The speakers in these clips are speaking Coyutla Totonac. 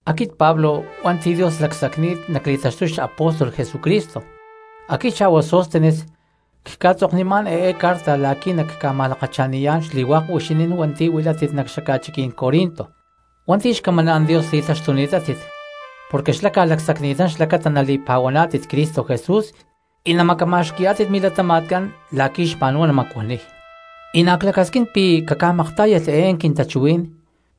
Aquit Pablo hua̠nti̠ Dios lacsacni̠t nacli̠taxtuy xapóstol Jesucristo. Aquit xa̠hua Sóstenes cca̠tzoknimá̠n eé carta la̠qui̠ nacca̠ma̠lakacha̠niyá̠n xli̠huák huixinín hua̠nti̠ huilátit nac xaca̠chiquí̠n Corinto hua̠nti̠ xcamaná̠n Dios li̠taxtuni̠tátit porque xlá ca̠lacsacni̠tán xlacata nali̠pa̠huaná̠tit Cristo Jesús y namacama̠xqui̠yá̠tit milatama̠tcán la̠qui̠ xma̠nhuá natamacuaniy, y na̠ clacasquín pi̠ caca̠maktá̠yalh eé quintachuhuí̠n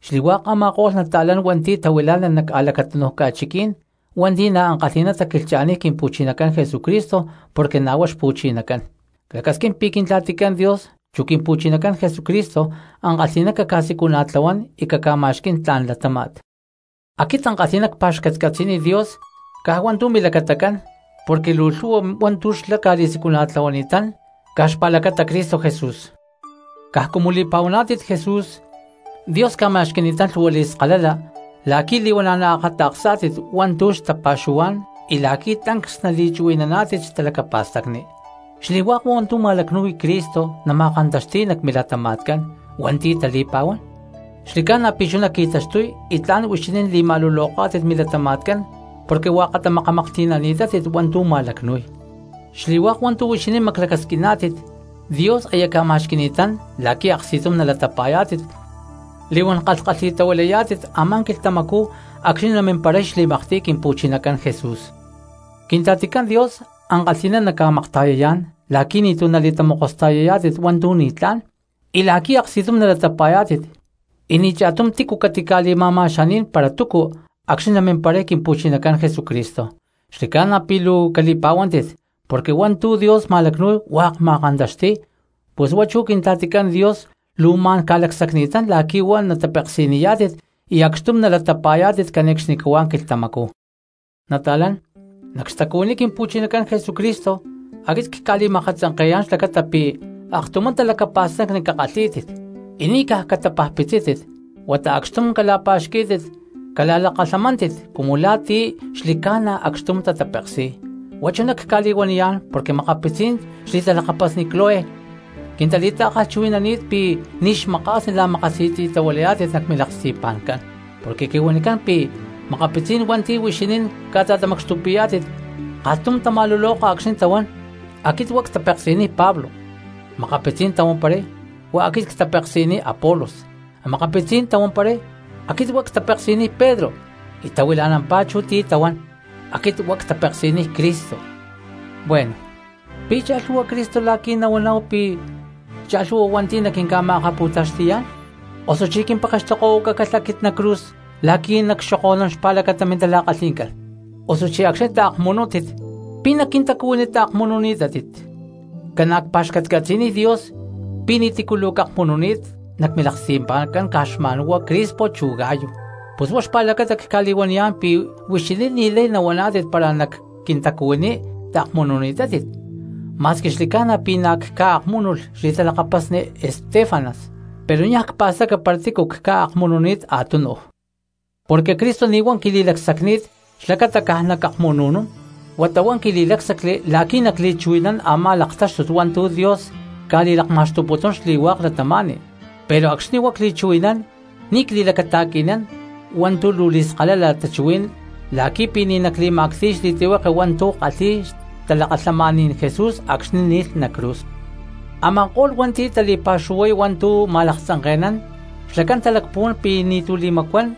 xli̠hua̠k a̠ma̠ko̠lh nata̠lán hua̠nti̠ tahuilá̠nalh nac a̠lacatúnuj ca̠chiqui̠ní̠n hua̠nti̠ na̠ ankalhi̠ná taquilhcha̠niy Quimpu̠chinacán Jesucristo porque na̠ huá Xpu̠chinacán. Clacasquín pi̠ Quintla̠ticán Dios chu Quimpu̠chinacán Jesucristo ankalhi̠ná caca̠siculana̠tlahuán y caca̠ma̠xqui̠n tla̠n latáma̠t. Aquit ankalhi̠ná cpa̠xcatcatzi̠niy Dios caj hua̠ntu̠ milacatacán porque luu lhu̠hua hua̠ntu̠ xlá ca̠li̠siculana̠tlahuani̠tán caj xpa̠lacata Cristo Jesús. Caj cumu li̠pa̠huaná̠tit Jesús Dios ca̠ma̠xqui̠ni̠tán lhu̠hua li̠skalala la̠qui̠ li̠huana̠ naakata̠ksá̠tit hua̠ntu̠ xtapa̠xuhuá̠n y la̠qui̠ tancs nali̠chuhui̠naná̠tit xtalacapa̠stacni. Xli̠hua̠k hua̠ntu̠ ma̠lacnu̠y Cristo nama̠kantaxti̠y nac milatama̠tcán hua̠nti̠ tali̠pa̠huán, xli̠ca̠na pi̠ chuná qui̠taxtuy y tla̠n huixinín li̠ma̠luloká̠tit milatama̠tcán porque hua̠katá makamaklhti̠nani̠tátit hua̠ntu̠ ma̠lacnu̠y. Xli̠hua̠k hua̠ntu̠ huixinín maclacasquiná̠tit Dios aya ca̠ma̠xqui̠ni̠tán la̠qui̠ aksti̠tum nalatapa̠yá̠tit li̠huán kalhkalhi̠tahuilayá̠tit a̠má quilhtamacú acxni̠ namimparay xli̠maktiy Quimpu̠chinacán Jesús. Quintla̠ticán Dios ankalhi̠ná naca̠makta̠yayá̠n la̠qui̠ ni̠tu̠ nali̠tamokosta̠yayá̠tit hua̠ntu̠ ni̠tlá̠n, y la̠qui̠ aksti̠tum nalatapa̠yá̠tit y ni̠ cha̠tum tícu catica̠li̠ma̠ma̠xaní̠n para túcu acxni̠ namimparay Quimpu̠chinacán Jesucristo. Xli̠ca̠na pi̠ luu cali̠pa̠huántit porque hua̠ntu̠ Dios ma̠lacnu̠y hua̠k ma̠kantaxti̠y, pus huá chú Quintla̠ticán Dios luu ma̠n ca̠lacsacni̠tán la̠qui̠ huá natapeksi̠niyá̠tit y acxtum nata̠latapa̠yá̠tit cane̠cxnicahuá quilhtamacú. Nata̠lán, nac xtacuhuiní Quimpu̠chinacán Jesucristo aquit cca̠li̠ma̠akatzanke̠yá̠n xlacata pi̠ aktumá talacapa̠stacni cakalhí̠tit y ni̠ caj catapajpitzítit huata acxtum cala̠pa̠xquí̠tit cala̠lakalhamántit cumu la̠ ti̠ xli̠ca̠na acxtum tatapeksi̠y. Huá chuná cca̠li̠huaniyá̠n porque makapitzí̠n xli̠talakapasni Cloé quintali̠ta̠kalhchuhui̠nani̠t pi̠ ni̠ xmaka̠sni la̠makasi̠tzi̠tahuilayá̠tit nac milaksti̠pa̠ncán. Porque quihuanicán pi̠ makapitzí̠n hua̠nti̠ huixinín ca̠ta̠tamacxtupi̠yá̠tit kalhtum tama̠luloka acxni̠ tahuán: “Aquit huá ctapeksi̠niy Pablo”; makapitzí̠n tahuamparay: “Huá aquit ctapeksi̠niy Apolos”; makapitzí̠n tahuamparay: “Aquit huá ctapeksi̠niy Pedro”; y tahuila̠nampá chú ti̠ tahuán: “Aquit huá ctapeksi̠niy Cristo.” Bueno, ¿pi̠ cha̠lhu̠hua Cristo la̠qui̠ nahuaná̠hu pi̠ cha̠lhu̠hua hua̠nti̠ naquinca̠ma̠akapu̠taxti̠yá̠n? ¿Osuchí quimpekextokohuacácalh aquit nac cruz la̠qui̠ nacxoko̠nún xpa̠lacata mintala̠kalhi̠ncán? Osuchí acxni̠ taakmunútit, ¿pi̠ nac quintacuhuiní taakmununi̠tátit? Ca̠na̠ cpa̠xcatcatzi̠niy Dios pi̠ ni̠tícu luu cakmununi̠t nac milaksti̠pa̠ncán, caj xma̠n huá Crispo chu Gayo. Pus huá xpa̠lacata cca̠li̠huaniyá̠n pi̠ huixinín ni̠lay nahuaná̠tit para nac quintacuhuiní taakmununi̠tátit. Ma̠squi xli̠ca̠na pi̠ na̠ cca̠akmúnulh xli̠talakapasni Estéfanas, pero niaj cpa̠staca para tícu cca̠akmununi̠t a̠túnuj. Porque Cristo ni̠ huá quili̠lacsacni̠t xlacata caj nacakmunu̠nún, huata huá quili̠lácsacli la̠qui̠ nacli̠chuhui̠nán a̠má laktáxtut hua̠ntu̠ Dios ca̠li̠lakma̠xtuputún xli̠hua̠k cristianos, pero acxni̠ huá cli̠chuhui̠nán ni̠ cli̠lacata̠qui̠nán hua̠ntu̠ luu li̠skalala tachuhuí̠n la̠qui̠ pi̠ ni̠ nacli̠ma̠cti̠y xli̠tlihueke hua̠ntu̠ kalhi̠y xtalakalhamaní̠n Jesús acxni̠ ni̠lh nac cruz. Ama̠ko̠lh cristianos hua̠nti̠ tali̠pa̠xuhuay hua̠ntu̠ ma̠laktzanke̠nán xlacán talacpuhuán pi̠ ni̠tu̠ li̠macuán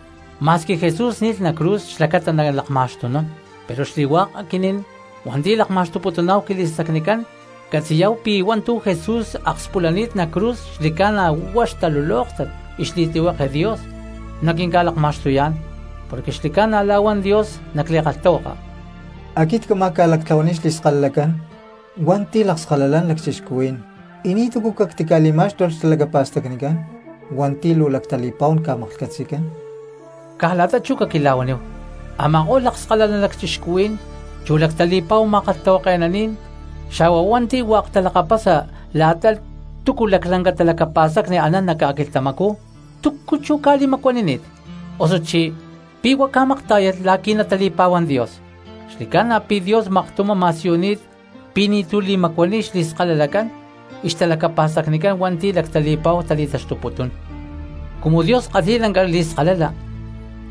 ma̠squi Jesús ni̠lh nac cruz xlacata nalakma̠xtunún; pero xli̠hua̠k aquinín hua̠nti̠ lakma̠xtuputuná̠hu quili̠stacnicán catzi̠yá̠hu pi̠ hua̠ntu̠ Jesús akspulani̠t nac cruz xli̠ca̠na huá xtalulóktat y xli̠tlihueke Dios naquinca̠lakma̠xtuyá̠n. Porque xli̠ca̠na la̠ huan Dios nac li̠kalhtahuaka: Aquit cámaj ca̠lactlahuaniy xli̠skalalacán hua̠nti̠ lakskalalán lacchixcuhuí̠n, y ni̠túcu cactili̠má̠xtulh xtalacapa̠stacnicán hua̠nti̠ luu lactali̠pa̠hu ca̠maklhcatzi̠cán. Caj la̠ta chú caquila̠huaníhu, a̠ma̠ko̠lh lakskalalán lacchixcuhuí̠n, chu lactali̠pa̠hu ma̠kalhtahuake̠naní̠n, xa̠hua hua̠nti̠ hua̠k talakapasa la̠ta túcu laclanca talacapa̠stacni anán nac ca̠quilhtamacú, ¿túcu chú ca̠li̠macuanini̠t? Osuchí ¿pi̠ huá ca̠maktá̠yalh la̠qui̠ natali̠pa̠huán Dios? Xli̠ca̠na pi̠ Dios maktumá ma̠siyuni̠t pi̠ ni̠tu̠ li̠macuaniy xli̠skalalacán y xtalacapa̠stacnicán hua̠nti̠ lactali̠pa̠hu tali̠taxtuputún. Cumu Dios kalhi̠y lanca li̠skalala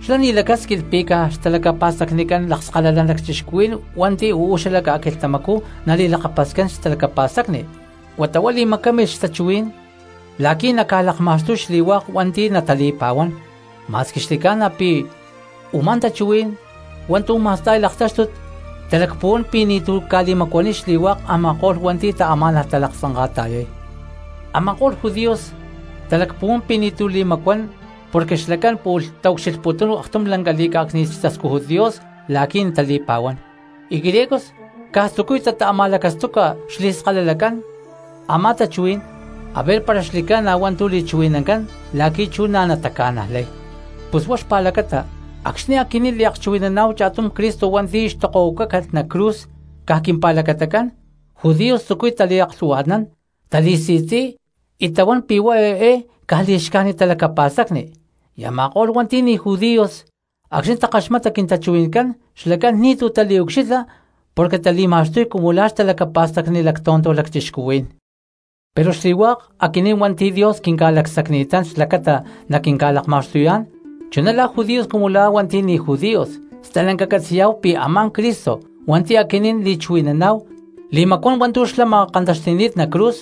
xlá ni̠ lacásquilh pi̠ caj xtalacapa̠stacnicán lakskalalán lacchixcuhuí̠n hua̠nti̠ uú xala ca̠quilhtamacú nali̠lakapascán xtalacapa̠stacni, huata huá li̠macámilh xtachuhuí̠n la̠qui̠ naca̠lakma̠xtuy xli̠hua̠k hua̠nti̠ natali̠pa̠huán, ma̠squi xli̠ca̠na pi̠ huá u̠má tachuhuí̠n hua̠ntu̠ ma̠sta̠y laktáxtut talacpuhuán pi̠ ni̠tu̠ ca̠li̠macuaniy xli̠hua̠k a̠ma̠ko̠lh hua̠nti̠ taamá̠nalh talaktzanka̠ta̠yay. Ama̠ko̠lh judíos talacpuhuán pi̠ ni̠tu̠ li̠macuán porque xlacán pu̠lh taucxilhputún aktum lanca li̠cá̠cni̠t xtascújut Dios la̠qui̠ natali̠pa̠huán, y griegos caj tzucuy tata̠ma̠lacastuca xli̠skalalacán a̠má tachuhuí̠n aver para xli̠ca̠na hua̠ntu̠ li̠chuhui̠nancán la̠qui̠ chú na̠ nataca̠najlay. Pus huá xpa̠lacata acxni̠ aquinín liakchuhui̠naná̠hu cha̠tum Cristo hua̠nti̠ xtokohuacácalh nac cruz caj quimpa̠lacatacán, judíos tzucuy taliaklhu̠hua̠tnán tali̠si̠tzi̠y y tahuán pi̠ huá eé caj li̠xcájnit talacapa̠stacni; y a̠ma̠ko̠lh hua̠nti̠ ni̠ judíos acxní takaxmata quintachuhui̠ncán xlacán ni̠tu̠ taliucxilha porque tali̠ma̠xtuy cumu la̠ xtalacapa̠stacni lactonto lacchixcuhuí̠n. Pero xli̠hua̠k aquinín hua̠nti̠ Dios quinca̠lacsacni̠tán xlacata naquinca̠lakma̠xtuyá̠n, chuná la̠ judíos cumu la̠ hua̠nti̠ ni̠ judíos, stalanca catzi̠yá̠hu pi̠ a̠má Cristo hua̠nti̠ aquinín li̠chuhui̠naná̠hu li̠macuán hua̠ntu̠ xlá ma̠kantaxti̠ni̠t nac cruz,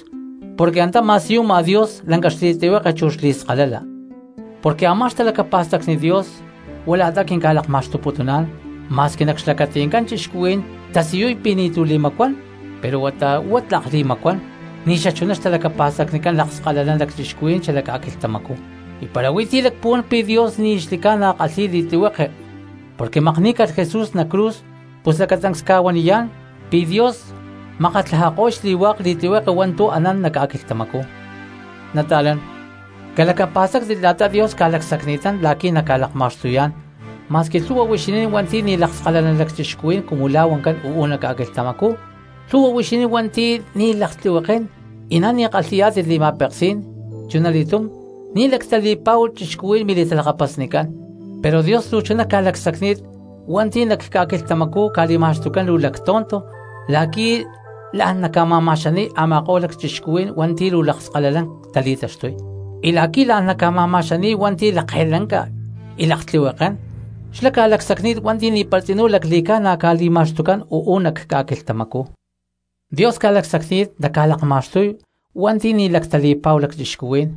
porque antá ma̠siyuma Dios lanca xli̠tlihueke chu xli̠skalala. Porque a̠má xtalacapa̠stacni Dios huá la̠ta quinca̠lakma̠xtuputuná̠n, ma̠squi nac xlacati̠ncán cristianos tasiyuy pi̠ ni̠tu̠ li̠macuán pero huata huá tlak li̠macuán ni̠xachuná xtalacapa̠stacnicán lakskalalán lacchixcuhuí̠n xala ca̠quilhtamacú. Y para huí ti̠ lacpuhuán pi̠ Dios ni̠ xli̠ca̠na kalhi̠y li̠tlihueke porque makní̠calh Jesús nac cruz pus lacatancs cca̠huaniyá̠n pi̠ Dios makatlajako̠y xli̠hua̠k li̠tlihueke hua̠ntu̠ anán nac ca̠quilhtamacú. Nata̠lán, calacapa̠stáctit la̠ta Dios ca̠lacsacni̠tán la̠qui̠ naca̠lakma̠xtuyá̠n ma̠squi lhu̠hua huixinín hua̠nti̠ ni̠ lakskalalán lacchixcuhuí̠n cumu la̠ huancán uú nac ca̠quilhtamacú, lhu̠hua huixinín hua̠nti̠ ni̠ laktlihuekén, y na̠ ni̠ kalhi̠yá̠tit li̠ma̠peksí̠n, chunali̠túm ni̠ lactali̠pa̠hu cristianos mili̠talakapasnicán. Pero Dios luu chuná ca̠lacsacni̠t hua̠nti̠ nac ca̠quilhtamacú ca̠li̠ma̠xtucán luu lactonto la̠qui̠ la̠n naca̠ma̠ma̠xani̠y a̠ma̠ko̠lh lacchixcuhuí̠n hua̠nti̠ luu lakskalalán tali̠taxtuy, y la̠qui̠ la̠n naca̠ma̠ma̠xani̠y hua̠nti̠ lakke̠lanca y laktlihuekén, xlá ca̠lacsacni̠t hua̠nti̠ ni̠para tzinú lacli̠ca̠na ca̠li̠ma̠xtucán uú nac ca̠quilhtamacú. Dios ca̠lacsacni̠t naca̠lakma̠xtuy hua̠nti̠ ni̠ lactali̠pa̠hu lacchixcuhuí̠n,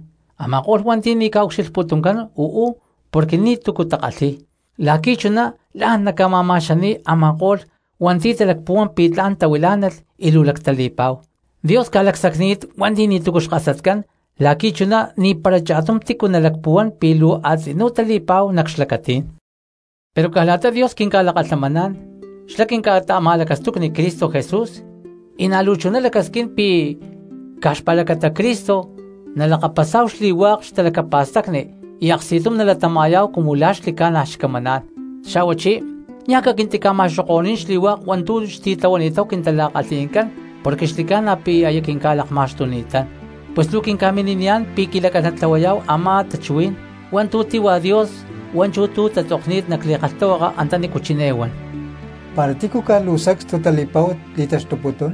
a̠ma̠ko̠lh hua̠nti̠ ni̠ ca̠ucxilhputuncán uú porque ni̠túcu takalhi̠y, la̠qui̠ chuná la̠n naca̠ma̠ma̠xani̠y a̠ma̠ko̠lh hua̠nti̠ talacpuhuán pi̠ tla̠n tahuilá̠nalh y luu lactali̠pa̠hu. Dios ca̠lacsacni̠t hua̠nti̠ ni̠túcu xkasatcán la̠qui̠ chuná ni̠para cha̠tum tícu nalacpuhuán pi̠ luu a̠tzinú tali̠pa̠hu nac xlacatí̠n. Pero caj la̠ta Dios quinca̠lakalhamaná̠n xlá quinca̠ta̠ma̠lacastucni Cristo Jesús, y na̠ luu chuná lacasquín pi̠ caj xpa̠lacata Cristo nalakapasá̠hu xli̠hua̠k xtalacapa̠stacni y aksti̠tum nalatama̠yá̠hu cumu la̠ xli̠ca̠na̠ xcamaná̠n, xa̠huachí niaj caquintica̠ma̠xoko̠ní̠n xli̠hua̠k hua̠ntu̠ xtitlahuani̠táhu quintala̠kalhi̠ncán porque xli̠ca̠na pi̠ aya quinca̠lakma̠xtuni̠tán. Pues luu quinca̠mini̠niyá̠n pi̠ quilacán natlahuayá̠hu a̠má tachuhuí̠n hua̠ntu̠ tíhua Dios hua̠nchú tu̠ tatzokni̠t nac li̠kalhtahuaka antanícu chiné huan: “Para tícu caj luu sacstu tali̠pa̠hu li̠taxtuputún,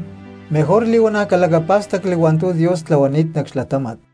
mejor li̠huana̠ calacapá̠stacli hua̠ntu̠ Dios tlahuani̠t nac xlatáma̠t.”